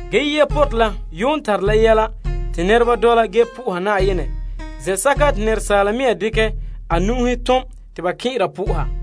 Ge yia nɔbiŋere la yuun tare la malema bo nɛreba n dɔla po'oha Na'ayenɛ se'em zɛn'sɛka te nɛresaala mɛŋa dekɛ a nu'uhen tom te ba kɛn'ɛra po'oha.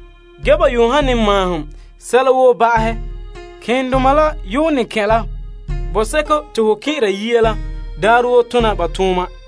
Te ban yuun ne han ta maahom sɛla woo ba'ahɛ, malemadoma la yuun ne kɛn' la pooren bɔseko te ba kɛn'ɛre yia la daarɛ woo tona ba tooma.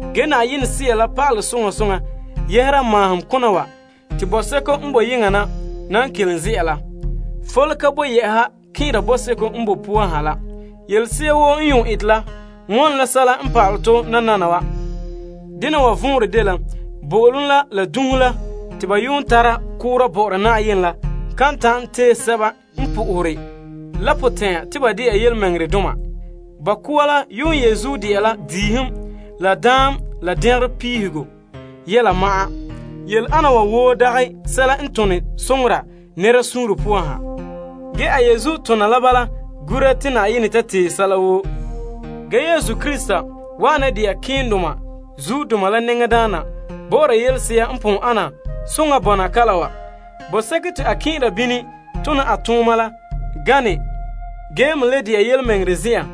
Na'ayenɛ Sea la pa'alɛ soŋa soŋa yɛhera maahom kona wa te Sogorɛ kɛka la n nan kelom ze'a la, fole ka boe yɛ'a kɛn'ɛra toolom zen'an la poan ha la. Yelese'a woo n yuun ete la wone la sɛla n pa'alɛ tɔ nananawa. Dena wa vɔnrɛ dela bo'olom la dunhe te ba yuun tara koora bɔ'ɔra Na'ayenɛ la kan ta'an tee sɛba n po'ohere la potɛn'ya te ba dɛna yelemɛŋɛrɛdoma. Ba koa la yuun dela diihom la daam la dɛngerɔ duuhego yɛla ma'an. Yele ana dagɛ sɛla n tone soŋora nɛra suunre poan ha ge a tona la bala gura te Na'ayenɛ ta tee sɛla woo. Krista n wa'ana dɛna malema nɛŋadaana la bɔ'ɔra yelese'a n ana soŋa bɔna kalam wa. Ge Sogorɛ te a kɛn'ɛra la gana ge me le de'a yelemɛŋɛrɛ zen'an,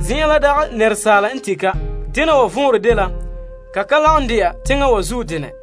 zen'an te nɛresaala ka tin'. Dena wa vɔnrɛ dela ka ka lagom dɛna teŋa wa zuo denɛ.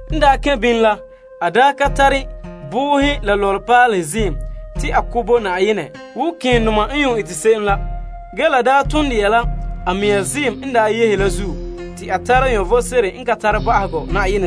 N daa kɛn' Saraa la, a daa ka tare boohe la lɔlepaalehe ziim te a ko' bo Na'ayenɛ wo malemadaana n yuun eta se'em la. Ge a daa ton de'a la a mea ziim n kae la zuo te to tara vom sebo n ka tare ba'ahegɔ.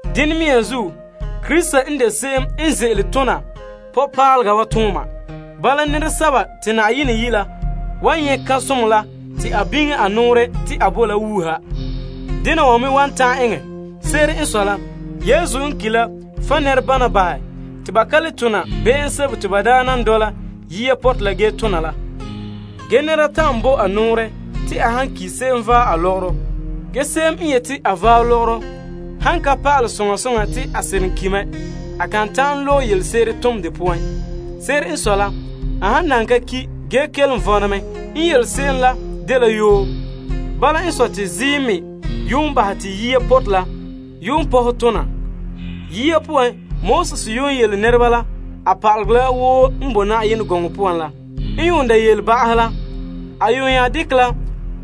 Dene mea zuo, Krista n de se'em n ze'ele tona nɔbiŋpaalega wa tooma. Bala, nɛresɛba te Na'ayenɛ yi' la wan nyɛ' kan'somɔ la te a biŋe a nɔɔrɛ te a bo la wuuha. Se'ere n sɔe la, Yesu n ki' la fan' nɛrebana bahɛ te ba ka le tona be'em sebo te ba daa nan tona yia nɔbiŋere saŋa la. Ge nɛra ta'an bo a nɔɔrɛ te a han ki', se'em vaɛ a lɔgɔrɔ ge se'em n yete a vaɛ a lɔgɔrɔ han ka pa'alɛ soŋa soŋa te a seren ki' mɛ, a kan ta'an loe yelese'ere tom de poan. Se'ere n sɔe la, a han nan ka ki' ge kelom vɔna mɛ, n yele se'em la dela yoo. Bala n sɔe te ziim me yuun bahɛ te yia nɔbiŋere la yuun pɔhɛ tona. Yia poan, Moses n yuun yele nɛreba la pa'alegɔ la woo n boe Yenɛ gɔŋɔ poan la, a nya dekɛ la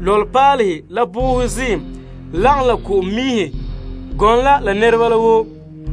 lɔlepaalehe ziim la ko'om la kɔnberɔ mɔlɔ la nyunhunyuŋa miihe gɔŋɔ la la nɛreba la woo,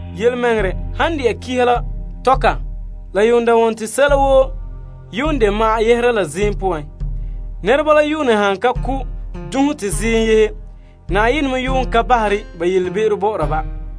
Pa'alegɔ la yele te ba duuhe sɛla woo ziim la poan. Ba yuun ne han ka ko' dunhe te ziim yehe, Na'ayenɛ me ka bahere ba be'em bɔ'ɔra ba.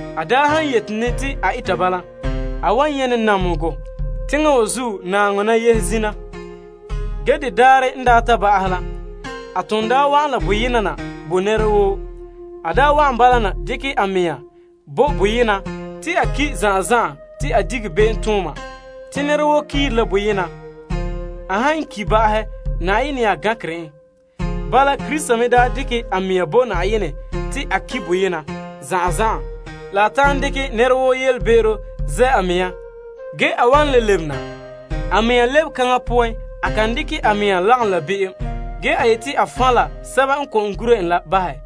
A daa han yete ne te a eta bala, a wan nyɛ' ne namehegɔ teŋa wa zuo naaŋɔ na yehe zina. Ge nananawa a ton daa wa'an la boyena na bo nɛra woo te a dekɛ la a mɛŋa bo boyena te a ki' zan'an zan'an te a dige be'emtooma. Te nɛra woo kiire la boyena te Na'ayenɛ nya gankere en. Bala, Krista me daa dekɛ a mɛŋa bo Na'ayenɛ te a ki' boyema zan'an zan'an la ta'an dekɛ nɛra woo be'em ze' a mɛŋa. Ge a wan le lebe na. Te a lebekaŋa poan na a ka ye'ehe na te a dekɛ la be'em bahɛ, ge a yeti a fan' la sɛba n gura en la bahɛ.